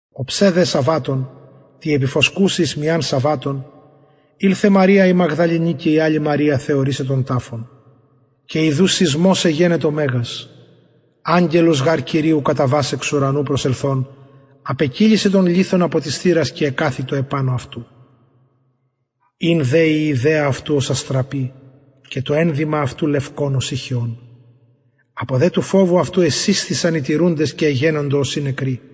οψε δε σαββατων τη επιφωσκουση εις μιαν σαββατων ηλθεν μαρια η μαγδαληνη και η αλλη μαρια θεωρησαι τον ταφον και ιδου σεισμος εγενετο μεγας αγγελος γαρ κυριου καταβας εξ ουρανου προσελθων απεκυλισεν τον λιθον απο της θυρας και εκαθητο επανω αυτου ην δε η ιδεα αυτου ως αστραπη και το ενδυμα αυτου λευκον ωσει χιων απο δε του φοβου αυτου εσεισθησαν οι τηρουντες και εγενοντο ωσει νεκροι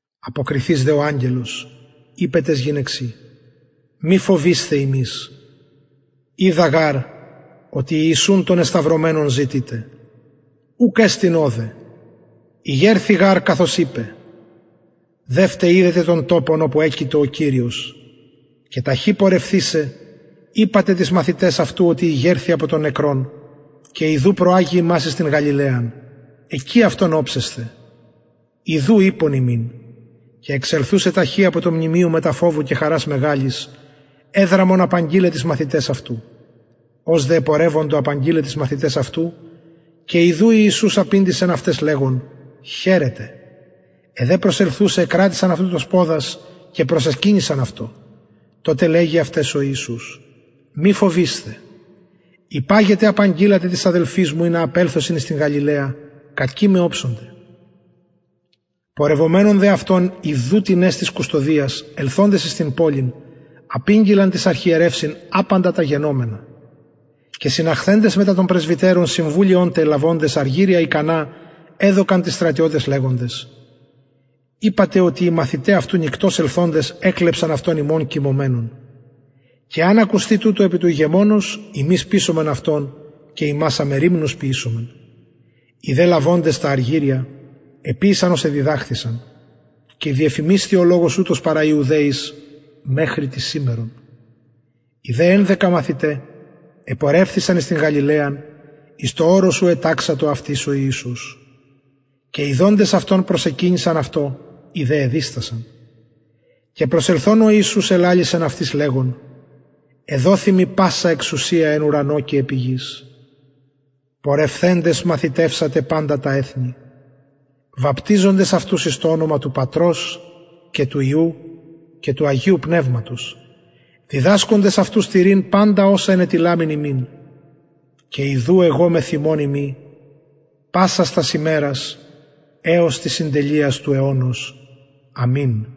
αποκριθεις δε ο αγγελος ειπεν ταις γυναιξιν μη φοβεισθε υμεις οιδα γαρ οτι ιησουν τον εσταυρωμενον ζητειτε ουκ εστιν ωδε ηγερθη γαρ καθως ειπεν δευτε ιδετε τον τοπον οπου εκειτο ο κυριος και ταχυ πορευθεισαι ειπατε τοις μαθηταις αυτου οτι ηγερθη απο των νεκρων και ιδου προαγει υμας εις την γαλιλαιαν εκει αυτον οψεσθε ιδου ειπον υμιν και εξελθουσαι ταχυ απο του μνημειου μετα φοβου και χαρας μεγαλης εδραμον απαγγειλαι τοις μαθηταις αυτου ως δε επορευοντο απαγγειλαι τοις μαθηταις αυτου και ιδου ιησους απηντησεν αυταις λεγων χαιρετε αι δε προσελθουσαι εκρατησαν αυτου τους ποδας και προσεκυνησαν αυτω τοτε λεγει αυταις ο ιησους μη φοβεισθε υπαγετε απαγγειλατε τοις αδελφοις μου ινα απελθωσιν εις την γαλιλαιαν και εκει με οψονται πορευομενων δε αυτων ιδου τινες της κουστωδιας ελθοντες εις την πολιν απηγγειλαν τοις αρχιερευσιν απαντα τα γενομενα και συναχθεντες μετα των πρεσβυτερων συμβουλιον τε λαβοντες αργυρια ικανα εδωκαν τοις στρατιωταις λεγοντες ειπατε οτι οι μαθηται αυτου νυκτος ελθοντες εκλεψαν αυτον ημων κοιμωμενων και εαν ακουσθη τουτο επι του ηγεμονος ημεις πεισομεν αυτον και υμας αμεριμνους ποιησομεν οι δε λαβοντες τα αργυρια εποιησαν ως εδιδαχθησαν και διεφημισθη ο λογος ουτος παρα ιουδαιοις μεχρι της σημερον οι δε ενδεκα μαθηται επορευθησαν εις την γαλιλαιαν εις το ορος ου εταξατο αυτοις ο ιησους και ιδοντες αυτον προσεκυνησαν αυτω οι δε εδιστασαν και προσελθων ο ιησους ελαλησεν αυτοις λεγων εδοθη μοι πασα εξουσια εν ουρανω και επι γης πορευθεντες μαθητευσατε παντα τα εθνη βαπτιζοντες αυτους εις το ονομα του πατρος και του υιου και του αγιου πνευματος διδασκοντες αυτους τηρειν παντα οσα ενετειλαμην υμιν και ιδου εγω μεθ υμων ειμι πασας τας ημερας εως της συντελειας του αιωνος αμην